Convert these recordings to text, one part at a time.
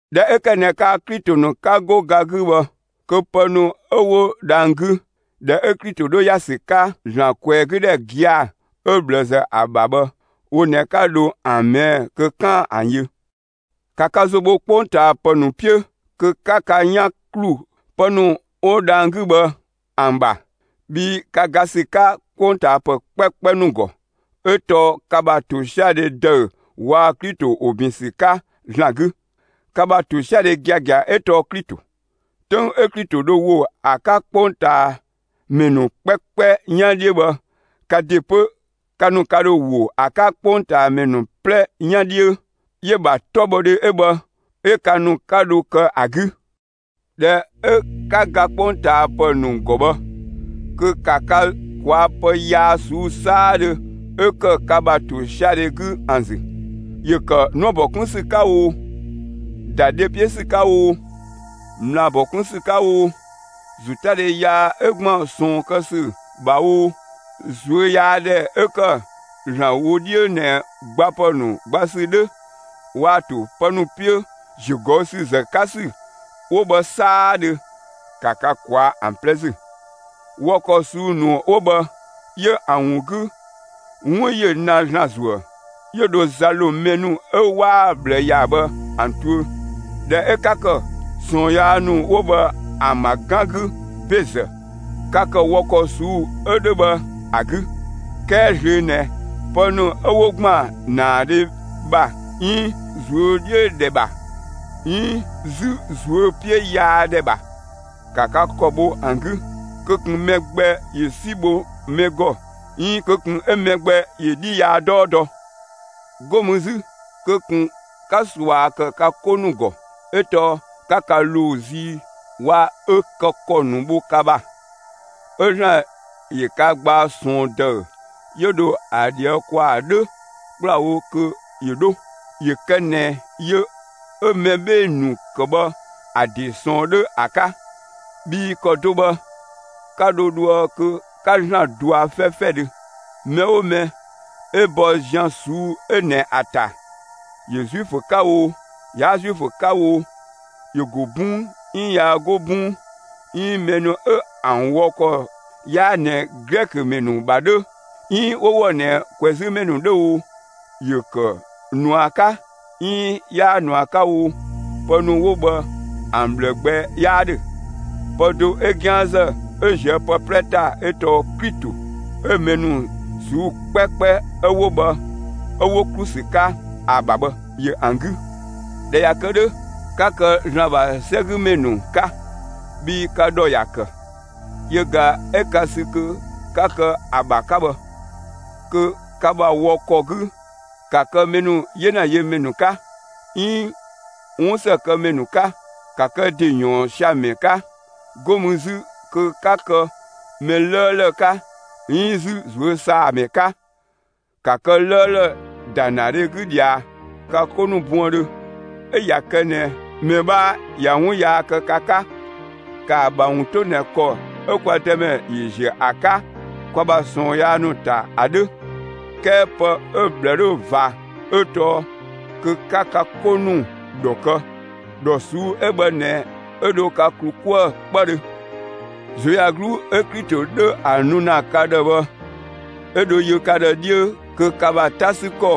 ꞊Dhɛ 'ö ‑kë ꞊nɛ kaa‑ Klito ‑nu 'ka 'go ga 'gü bhë, kö pë ‑nu 'ö 'wo dhang‑ 'gü, ‑dhɛ 'ö Klito 'dhö ‑ya ‑sü 'ka ‑Zlan ꞊kwɛɛgüdhɛ gia‑ 'ö ꞊bhlëzë ‑a ‑bha bhë, wo ꞊nɛ 'ka dho ‑an ꞊mɛɛ'‑ kö 'kaan‑ ‑an yö. 'Ka ka ‑zo bho 'kpongtaapë ‑nu 'piö kö 'ka ka 'yan ‑klu pë ‑nu 'wo dhang‑ 'gü bhë ‑an ‑bha! Bhii ka ga ‑sü 'ka 'kpongtaapë 'kpɛkpɛ ‑nu ‑gɔ, 'ö tɔɔ ka ‑bha ‑tosiadhe ‑dëü waa‑ Klito ‑wo ‑bin ‑sü 'ka ‑Zlan 'gü. Ka ‑bha ‑tosiadhe giagia 'ö tɔɔ Klito. 'Töng 'ö Klito dho ‑wo ‑a 'ka 'kpongtaamɛ ‑nu 'kpɛkpɛ 'yan 'dhiö bhë, ka ‑de 'pö, ka ‑nu ka ‑dho ‑wo ‑a 'ka 'kpongtaamɛ ‑nu 'plɛ 'yan 'dhiö; 'yö‑ ‑bha 'tɔbhɔdhe 'ö bhë, 'yö ka ‑nu 'ka dho kë ‑a 'gü. ꞊Dhɛ 'ö 'ka ga 'kpongtaapë ‑nu ‑gɔ bhë, kö ‑ka ka ꞊kwaa'‑ pë yaa ꞊suu'‑ 'saadhö 'ö ‑kë ka ‑bha ‑tosiadhe 'gü ‑an ‑zü! ‑Yö ‑kë 'nuëbɔ 'kun ‑sü 'ka oo, ‑da dhe 'piö ‑sü 'ka oo, ꞊mlaabɔ 'kun ‑sü 'ka oo, ‑zotadhe yaa 'ö ‑gban ꞊sɔɔn kë ‑sü ‑bha oo, ꞊zuöyaadhɛ 'ö ‑kë ‑Zlan wö 'dhiö ꞊nɛ gbapë ‑nu gba ‑sü 'dhö, waa‑ ‑to pë ‑nu 'piö ‑ziögɔüsüzë 'ka ‑sü 'wo bhë 'saadhö, ‑ka ka ꞊kwaa' ‑an 'plɛ ‑zü! Wɔ ‑kɔ ꞊suu'‑ ‑nu 'wo bhë, 'yö ‑an ‑wun 'gü, 'wun ‑yö na ‑Zlan ‑zuë, 'yö dho za ‑lo mɛ ‑nu 'ö 'waa‑ ꞊bhlë ‑ya bhë ‑an tuö. ꞊Dhɛ 'ö 'ka ‑kë ꞊sɔɔn yaa ‑nu 'wo bhë ‑an ‑bha 'gan 'gü ‑bezë, ka ‑kë wɔ ‑kɔ ꞊suu'‑ 'ö 'dhö bhë ‑a 'gü. 'Kɛɛ zlöö ꞊nɛ pë ‑nu 'ö 'wo ‑gban ‑naadhe ‑bha 'iin ꞊zuö' 'dhiö‑ ‑dhɛ ‑bha 'iin 'zü ꞊zuö' 'piö yaa ‑dhɛ ‑bha, ‑ka ka ‑kɔ bho ‑an 'gü! Kö ꞊kun mɛ gbɛ ‑yö 'si bho mɛ ‑gɔ 'iin kö ꞊kun 'ö mɛ gbɛ ‑yö 'dhi yaa 'dɔɔ dɔ! 'Go mü 'zü kö ꞊kun 'ka ꞊sua ‑kë ka 'ko ‑nu ‑gɔ! 'Ö tɔɔ 'ka ka ‑loo zii waa‑ ö kë ‑kɔ ‑nu bho ka ‑bha. 'Ö ‑Zlan ‑yö ka gbaa ꞊sɔɔn ‑dëü 'yö dho ‑a ꞊dhië' ‑kwaa 'dhö ‑kplawo kö ‑yö 'dho, ‑yö kë ꞊nɛ yö 'ö mɛ 'bhee‑ ‑nu ‑kë bhë ‑a ‑de ꞊sɔɔn 'dhö ‑a 'ka. Bhii ‑kɔ do bhë, 'ka dho dhoë kö 'ka ‑Zlan ꞊dɔa' 'fɛfɛdhö. Mɛ 'oo mɛ 'ö bɔ zian ꞊suu'‑ 'ö ꞊nɛ ‑a ‑ta, ‑yö Zuifö 'ka oo, 'yaa Zuifö 'ka oo, ‑yö ‑go 'bɔn 'iin 'yaa 'go 'bɔng, 'iin mɛ ‑nu 'ö ‑an wɔ ‑kɔ 'yaa ꞊nɛ Glɛkö ‑mɛ ‑nu ‑bha 'dhö 'iin 'wo ‑wɔ ꞊nɛ ꞊kwɛzümɛ ‑nu 'dhö oo, ‑yö ‑kë ꞊nua 'ka 'iin 'yaa ꞊nua 'ka oo, pë ‑nu 'wo bhë ‑an ꞊bhlë gbɛ 'yaa 'dhö. Pë do 'ö 'gianzë 'ö ꞊zië' pë 'plɛ ‑ta 'ö tɔɔ Klito 'ö mɛ ‑nu ꞊suu'‑ 'kpɛkpɛ 'ö 'wo bhë 'ö 'wo ‑klu ‑sü 'ka ‑a ‑bha bhë, ‑yö ‑an 'gü. ꞊Dhɛ ꞊ya kë 'dhö, 'ka kë ‑Zlan ‑bha 'sɛgümɛ ‑nu 'ka, bhii ka ‑dhɔ ‑ya ‑kë, yö ꞊ga 'ö ka sü kö 'ka kë ‑a ‑bha 'ka bhë. Kö ka ‑bha wɔ ‑kɔ 'gü, ‑ka kë mɛ ‑nu 'yena yö ‑mɛ ‑nu 'ka, 'iin 'wunsëkëmɛ ‑nu 'ka. Ka kë ‑de ‑yɔɔn sia‑ ‑mɛ 'ka. 'Go mü 'zü kö 'ka kë mɛ 'lëëlë 'ka 'iin 'zü ꞊zuösaamɛ 'ka. ‑Ka kë 'lëëlë ‑da ‑naadhe 'gü ꞊dhia ka 'ko ‑nu buëndhö! 'Ö ꞊ya kë ꞊nɛ mɛ 'bhaa ꞊ya 'wun yaa ‑kë ka 'ka, ‑kaa ‑bha ‑wun 'to ꞊nɛ ‑kɔ 'ö kwa Dëmɛ ‑yö ‑ziö ‑a 'ka ka ‑bha ꞊sɔɔn yaa ‑nu ‑ta ‑a 'dhö! 'Kɛɛ pë 'ö‑ ꞊bhlë 'dhö ꞊va 'ö tɔɔ kö 'ka ka 'ko ‑nu ‑dhɔ kë. ‑Dhɔ ꞊suu'‑ 'ö bhë ꞊nɛ 'ö dho ka ‑klu 'kuë‑ 'kpëdhö. ꞊Zuöyagluu 'ö Klito 'dhö ‑a nu ‑na ka ‑dhë bhë 'ö dho yö ka ‑dhë 'dhiö kö ka ‑bha 'ta 'sü ‑kɔ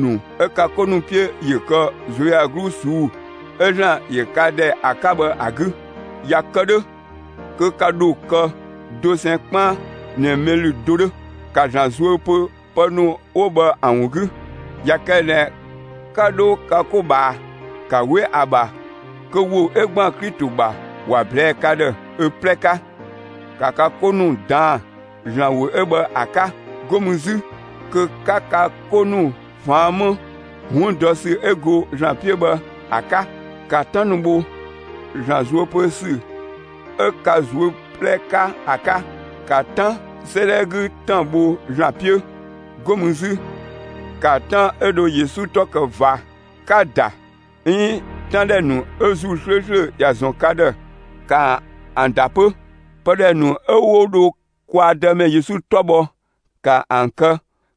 ‑nu 'ö ka 'ko ‑nu 'piö ‑yö kë ꞊zuöyagluu ꞊suu'‑ 'ö ‑Zlan ‑yö ka ‑dhɛ ‑a 'ka bhë ‑a 'gü. ꞊Ya kë 'dhö kö ka ‑dho kë dosɛn 'kpaan ꞊nɛ mɛ ‑lü do 'dhö. ‑Ka ‑Zlan zuö pö pë ‑nu 'wo bhë ‑an ‑wun 'gü! ꞊Ya kë ꞊nɛ 'ka 'dho ka 'ko ꞊bhaa, ‑ka 'we ‑a ‑bha kö ‑wo 'ö ‑gban Klito ‑bha ‑wa ꞊blɛɛ'‑ ka ‑dhë ö 'plɛ 'ka! ‑Ka ka 'ko ‑nu ꞊daan'‑ ‑Zlan ‑wo 'ö bhë ‑a 'ka! 'Go mü 'zü kö 'ka ka 'ko ‑nu ꞊faan' 'më 'wun dɔ ‑sü 'ö go ‑Zlan 'piö bhë ‑a 'ka. ‑Ka 'tan ‑nu bho ‑Zlan zuö pö ‑sü 'ö ka ꞊zuö' 'plɛ 'ka ‑a 'ka! ‑Ka 'Tan 'sëëdhɛ 'gü ‑tan bho ‑Zlan 'piö! 'Go mü 'zü, ‑ka 'tan 'ö dho Yesu 'tɔ kë ꞊va, 'ka‑ ‑da 'iin 'tan ‑dhɛ ‑nu 'ö ‑Zuu 'slööslö ‑ya ‑zɔn ka ‑dhë, ‑ka ‑an ‑da 'pö! Pë ‑dhɛ ‑nu 'ö 'wo dho kwa Dëmɛ Yesu 'tɔ bhɔ, ‑ka ‑an kë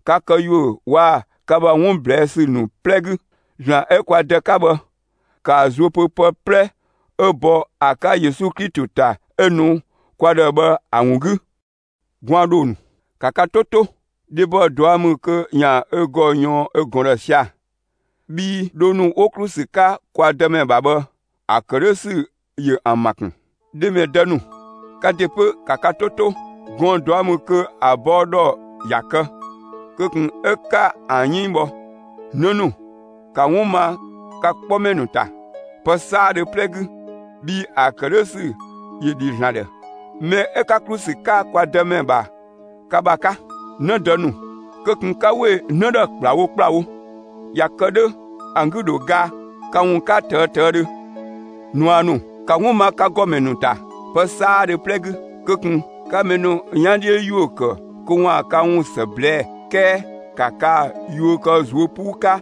ka këyuö waa‑ ka ‑bha 'wun ꞊blɛɛ' ‑sü ‑nu 'plɛ 'gü! ‑Zlan 'ö kwa Dë 'ka bhë, ‑kaa zuö pö pë 'plɛ 'ö bɔ ‑a 'ka Yesu Klito ‑ta 'ö‑ nu kwa ‑dhë bhë ‑a ‑wun 'gü! Gwaan ‑dhoo ‑nu, ‑ka ka 'to 'to! Dhebɔ ꞊dua' ‑mü kö ‑yaan ö ‑gɔ ꞊yɔɔn ö ꞊gɔn ‑dhë sia‑. Bhii dhoo ‑nu 'wo ‑klu ‑sü 'ka kwa Dëmɛ ‑bha bhë, ‑a ‑kë 'dhö ‑sü ‑yö ‑an ‑ma ‑kun. Dhe ‑mɛ dë ‑nu, ka ‑de 'pö, ‑ka ka 'to 'to! Gɔɔn‑ ꞊dua' ‑mü kö ‑a bɔɔ ‑dhɔ ‑ya kë; kö ꞊kun 'ö 'ka ‑an 'yënng bhɔ! 'Në ‑nu, ‑ka 'wun ma ka 'kpɔmɛ ‑nu ‑ta, pë 'saadhö 'plɛ 'gü! Bhii ‑a ‑kë 'dhö ‑sü ‑yö ‑dhi ‑Zlan ‑dhë, mɛ 'ö 'ka ‑klu ‑sü 'ka kwa Dëmɛ ‑bha ka ‑bha 'ka. 'Në dë ‑nu, kö ꞊kun 'ka ‑we 'në ‑dhë ‑kplawo ‑kplawo! ꞊Ya kë 'dhö, ‑an 'gü dho ga ka ‑wun 'ka ꞊tëë' ꞊tëëdhö. ꞊Nua ‑nu, ‑ka 'wun ma ka ‑gɔmɛ ‑nu ‑ta, pë 'saadhö 'plɛ 'gü! Kö ꞊kun 'ka mɛ ‑nu 'yan 'dhiö ‑yuö ‑kë kö ‑waan ka ‑wun ‑së ꞊blɛɛ'‑, 'kɛɛ ‑ka kaa‑ yuö kë ꞊zuö' 'puu 'ka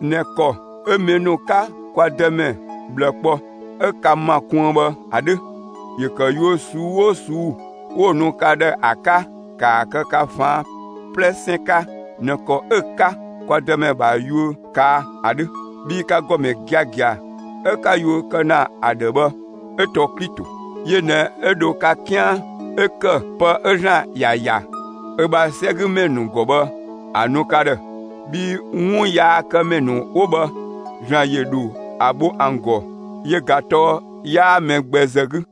꞊nɛ ‑kɔ 'ö mɛ ‑nu 'ka kwa Dëmɛ ꞊bhlë kpɔ 'ö ka ‑ma kuën bhë ‑a 'dhö. ‑Yö ‑kë yuö ꞊suu'‑ 'oo ꞊suu'‑ 'wo‑ nu ka ‑dhë ‑a 'ka, ‑kaa kë ka ꞊faan' 'plɛsɛn 'ka ꞊nɛ ‑kɔ 'ö 'ka kwa Dëmɛ ‑bha yuö ꞊kaa' ‑a 'dhö! Bhii ka ‑gɔmɛ giagia 'ö 'ka yuö kë ‑na ‑a ‑dhë bhë, 'ö tɔɔ Klito; yö ꞊nɛ 'ö dho ka 'kian 'ö ‑kë pë 'ö ‑Zlan ‑ya ‑ya ö ‑bha 'sɛgümɛ ‑nu ‑gɔ bhë ‑a nu ka ‑dhë. Bhii 'wun yaakëmɛ ‑nu 'wo bhë, ‑Zlan ‑yö ‑dho ‑a bho ‑an ‑gɔ, yö ꞊ga tɔɔ 'yaa mɛ gbɛ ‑zë 'gü.